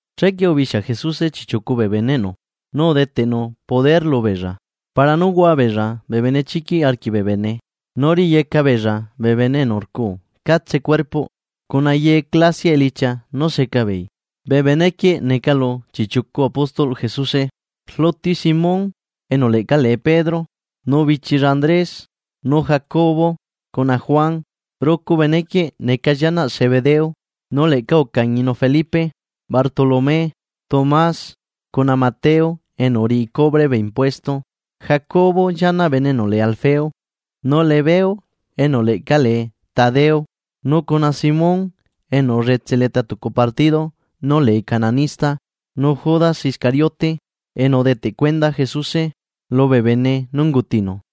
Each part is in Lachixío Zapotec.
Chequie ubixia Jesuse chiꞌchiucu bee beneꞌnu, nu udeteꞌnu poder lubeella para nú hua beella bee benechiquiꞌ arquiꞌ bee bene nu riyeca beella bee bene enu rcuu catse cuerpoꞌ, cuna ye clasiaꞌ elichia nú seca beei. Bee benequieꞌ neca lu chiꞌchiucu apóstolꞌ Jesuse: Rluti, Simón enu leꞌca lee Pedro, nu bichilla Andrés; nu Jacobo cuna Juan, rucu benequieꞌ neca llianaꞌ Zebedeo. Nu leꞌca ucañinu Felipe, Bartolomé, Tomás cuna Mateo enu uriꞌi cubre bee impuesto; Jacobo llianaꞌ bene enu lee Alfeo; nu Lebeo enu leꞌca lee Tadeo. Nu cuna Simón enu ullutse leta tucu partido nú lee cananista; nu Judas Iscariote enu udeteꞌ cuenda Jesuse lubee bene nú ungutinu.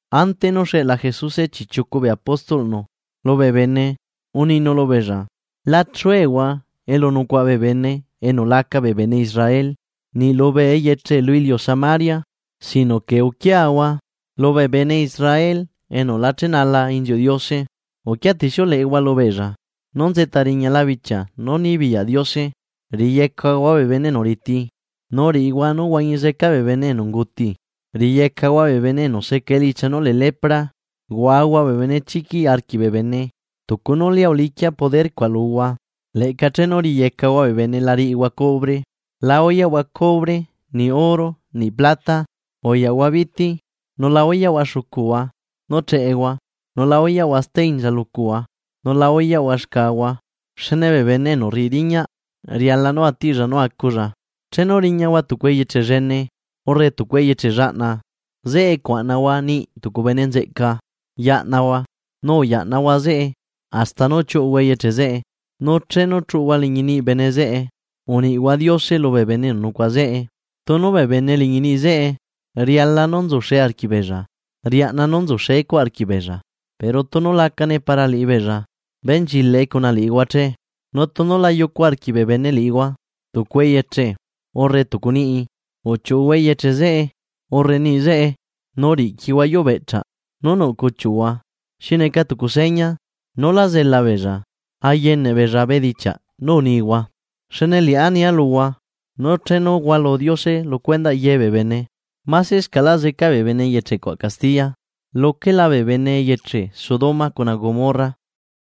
Ante nú xeꞌla Jesuse chiꞌchiucu bee apóstolꞌnu lubee bene uninu lubeella: ―La chuehua elu nucuaꞌa bee bene enu la neca bee bene Israel niꞌ lubee eyeche lu iliu Samaria; sino que uquiahua lubee bene Israel enu la chenala inziuꞌ Diose. Uquiatixiuleꞌehua lubeella nú nzeꞌta riñala bichia nú nibiyaꞌ Diose. Riyecahua bee bene enu riti, nu riꞌihua nú huañi zeca bee bene enu unguti, riyecahua bee bene enu seca elichia nú lee lepra, huahua bee benechiquiꞌ arquiꞌ bee bene. Tucu nú lia uliquia poder cuaꞌ luhua, leꞌca chenu riyecahua bee bene la riꞌihua cobre. ’La uyaꞌhua cobre niꞌ oro niꞌ plata. Uyaꞌhua biti, nu la uyaꞌhua xucuhua nú cheꞌehua, nu la uyaꞌhua steinza lucuhua, nula uyaꞌhua xcahua, xne bee bene enu rriꞌi riñaꞌ riala nú atiꞌlla nú aculla. ’Chenu riñahua tucu eyeche llene urre tucu eyeche llaꞌna, zeꞌe cuaꞌnahua niꞌi tucu bene nzeꞌca yaꞌnahua nu uyaꞌnahua zeꞌe hasta nú chiuꞌuhua eyeche zeꞌe. Nu chenu chuꞌuhua liñi niꞌi bene zeꞌe, uniꞌhua Diose lubee bene enu nucuaꞌa zeꞌe. Tunu bee bene liñi niꞌi zeꞌe riala nú nzuxe arquiꞌbeella, riaꞌna nú nzuxe cuaꞌ arquiꞌbeella, pero tunu lacane para liꞌibeella, benchilaꞌe cuna liꞌihua che. Nu tunu la yucu arquiꞌ bee bene liꞌihua tucu eyeche urre tucu niꞌi, uchiuꞌuhua eyeche zeꞌe urre niꞌi zeꞌe, nu riꞌquihua yuubeꞌchaꞌ nú nuꞌ cuchiuꞌhua, xi neca tucu seña nulá zela beella ayeneꞌ beella bedichiaꞌ nú unihua. Xne liꞌá nia luhua nu chenu hualu Diose lu cuendaꞌ yebee bene, masescaꞌla zeca bee bene eyeche cuaꞌ castiya luquela bee bene eyeche Sodoma cuna Gomorra.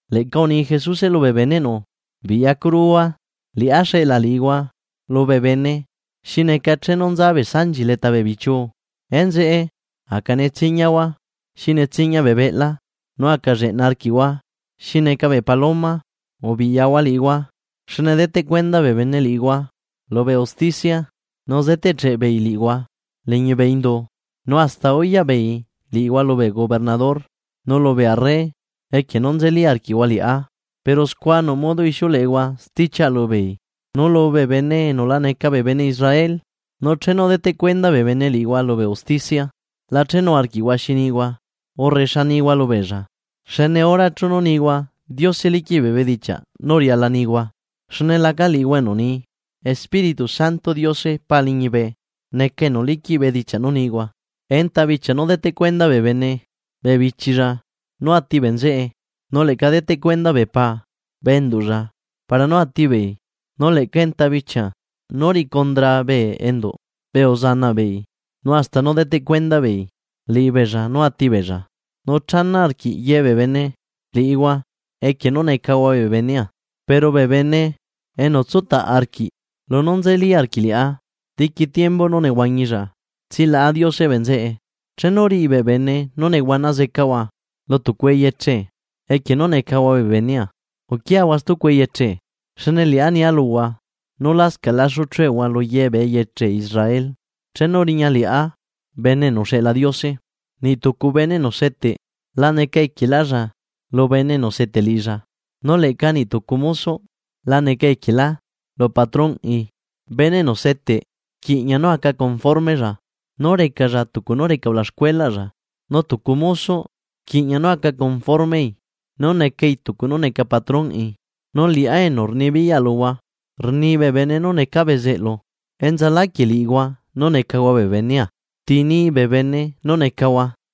Leꞌca uni Jesuse lubee beneꞌnu: ―¡Biꞌyacuruhua! Liꞌá xeꞌla liꞌihua lubee bene xi neca chenu nza bee sanchi leta bee bichiuu. Enzeꞌe aca netsiñahua xi netsiña bee beꞌla nu aca lleꞌna arquiꞌhua xi neca bee paloma. Ubiꞌyahua liꞌihua xne deteꞌ cuenda bee bene liꞌihua lubee usticia nu zeteꞌcheꞌ beei liꞌihua liñi bee indu. Nu hasta uyaꞌ beei liꞌihua lubee gobernador nu lubee arre equie nú nzeli arquiꞌhua liꞌá, pero scua nuꞌ modo ixiuleꞌehua stichiaꞌa lubeei, nu lubee bene enu la neca bee bene Israel. Nu chenu deteꞌ cuenda bee bene liꞌihua lubee usticia, la chenu arquiꞌhua xi nihua urre xa nihua lubeella; xne hora nú nihua Diose liquiꞌ bee bedichiaꞌ nú riala nihua. Xne laca liꞌihua enu ni. Espíritu Santoꞌ Diose Pa liñibe neca enu liquiꞌ bedichiaꞌ nú nihua. ’Enta bichia nú deteꞌ cuenda bee bene bee bichilla nú ati bee nzeꞌe, nu leꞌca deteꞌ cuenda bee paa bee enduꞌlla para nú ati beei. Nu leꞌca enta bichia nú riꞌi condra bee enduꞌ bee uzanaꞌ beei nu hasta nú deteꞌ cuenda beei liꞌibeella nú ati beella. Nu chana arquiꞌ ye bee bene liꞌihua equie nú necahua bee benea. Pero bee bene enu tsutaꞌ arquiꞌ lunú nzeli arquiꞌ liꞌá diqui tiembu nú nehuañilla, tsilaꞌa Diose bee nzeꞌe. Chenu riꞌi bee bene nú nehuana zecahua lu tucu eyeche equie nú necahua bee benea, uquiahua stucu eyeche, xne liꞌá nia luhua nu lascaꞌ laxu chuehua lu yebee eyeche Israel chenu riña liꞌá Bene enu uxeꞌla Diose. ’Niꞌ tucu bene enu seteꞌ la neca equielálla lu bene enu seteꞌ liꞌilla, nu leꞌca niꞌ tucu mosoꞌ la neca equielá lu patronꞌi. Bene enu seteꞌ rquiꞌña nú aca conformella nú recalla tucu nú reca ulaxcuelaꞌlla, nu tucu mosoꞌ rquiꞌña nú aca conformei nú necai tucu nú neca patronꞌi. Nu liꞌá enu rnibiyaꞌa luhua rni bee bene nú necaa bezeꞌlu, ¿enzaláquieꞌ liꞌihua nú necahua bee benea ti ni bee bene nú necahua?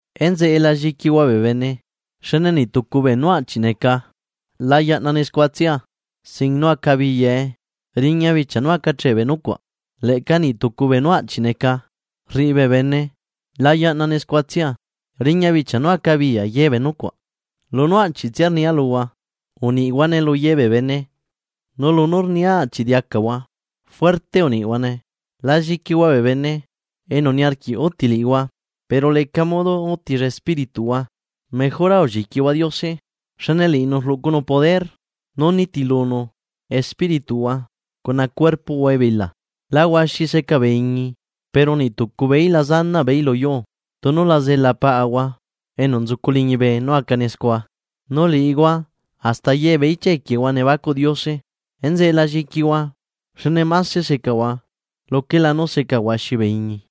’Enzeꞌe la lliquihua bee bene. Xne niꞌ tucu beenú aꞌchiꞌ neca la yaꞌnane scuatsia sin nú acabiyae, riña bichia nu acache bee nucuaꞌ, leꞌca niꞌ tucu beenú aꞌchi neca rriꞌi bee bene la yaꞌnane scuatsia, riña bichia nú acabiya yebee nucuaꞌ. Lunú aꞌchiꞌtsia rnia luhua, uniꞌhuane lu yebee bene nu lunú rnia aꞌchi diacahua. Juerte uniꞌhuane. La lliquihua bee bene enu niarquiꞌ uti liꞌihua. Pero leca modo utilla espírituꞌhua. Mejora ulliquihua Diose, xne liꞌinu rluꞌcunu poder nú nitilunu espírituꞌhua cuna cuerpoꞌhua ebila. ’¿La huaxi seca bee iñi? Pero niꞌ tucu beeí la zanaꞌ beeí lu yuu tunu la zela Paꞌahua enu nzucu liñibe nú acane scua. Nu liꞌihua hasta yebee ichia equiehua nebacuꞌ Diose. Enzeꞌe la lliquihua. Xne mase secahua luquela nú seca huaxi bee iñi.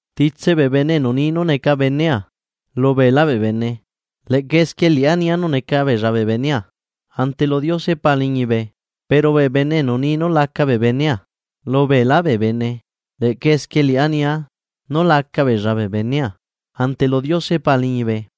’Titse bee bene enu ni nú neca benea lu beelá bee bene, leꞌca esquie liꞌá nia nú neca beella bee benea ante lu Diose Pa liñibe. Pero bee bene enu ni nú laca bee benea lu beelá bee bene, leꞌca esquie liꞌá nia nú laca beella bee benea ante lu Diose Pa liñibe.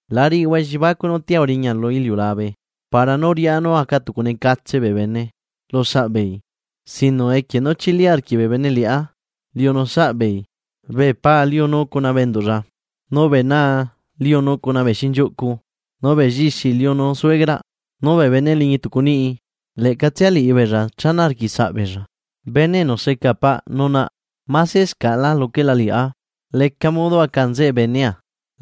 ’La riꞌihua elliebacuꞌ nú tia uriña lu iliulabe para nú riꞌá nú aca tucunecatse bee bene lu saꞌbeei, sino equie nú chili arquiꞌ bee bene liꞌá liunu saꞌbeei. Bee pa liunu cuna bee enduꞌlla, nu bee naa liunu cuna bee xinchiuꞌcu nu bee llixi liunu suegraꞌ. Nu bee bene liñi tucu niꞌi leꞌcatsia liꞌibeella chana arquiꞌ saꞌ beella. ’Bene enu seca paꞌ nu naꞌ masescaꞌlá luquela liꞌá, leca modo aca nzeꞌe benea,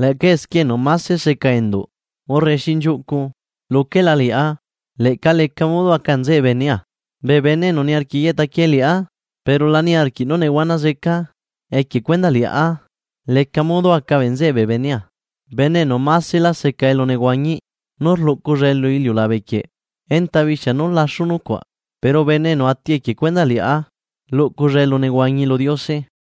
leꞌca esquie enu mase seca enduꞌ urre xinchiuꞌcu luquela liꞌá, leꞌca leca modo aca nzeꞌe benea. Bee bene enu niarquiꞌ yeꞌta quie liꞌá pero la niarquiꞌ nú nehuana zeca equie cuendaꞌ liꞌá, leca modo aca bee nzeꞌe bee benea. Bene enu maselá seca elunehuañi nú rluꞌculla lu iliulabe quieꞌ enta bichia nú laxu nucuaꞌ; pero bene enu ati equie cuendaꞌ liꞌá, luꞌculla elunehuañi lu Diose.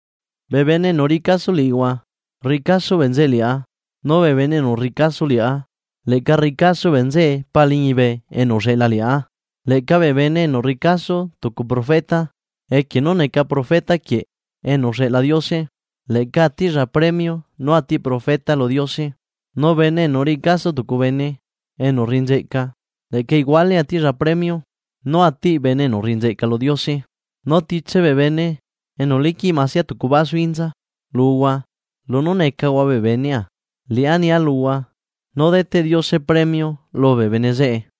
’Bee bene enu riꞌi caso liꞌihua, rriꞌi caso bee nzeꞌe liꞌá; nu bee bene enu rriꞌi caso liꞌá leꞌca rriꞌi caso bee nzeꞌe Pa liñibe enu uxeꞌla liꞌá. Leꞌca bee bene enu rriꞌi caso tucu profeta equie nú neca profeta quieꞌ enu uxeꞌla Diose, leꞌca atiꞌlla premio nú atiꞌ profeta lu Diose. Nu bene enu riꞌi caso tucu bene enu rriꞌi nzeꞌca, leꞌca iguale atiꞌlla premio nú atiꞌ bene enu rriꞌi nzeꞌca lu Diose. Nu titse bee bene enu liquiꞌ masia tucu basu inza luhua lunú necahua bee benea, liꞌá nia luhua nú deteꞌ Diose premio lubee bene zeꞌe.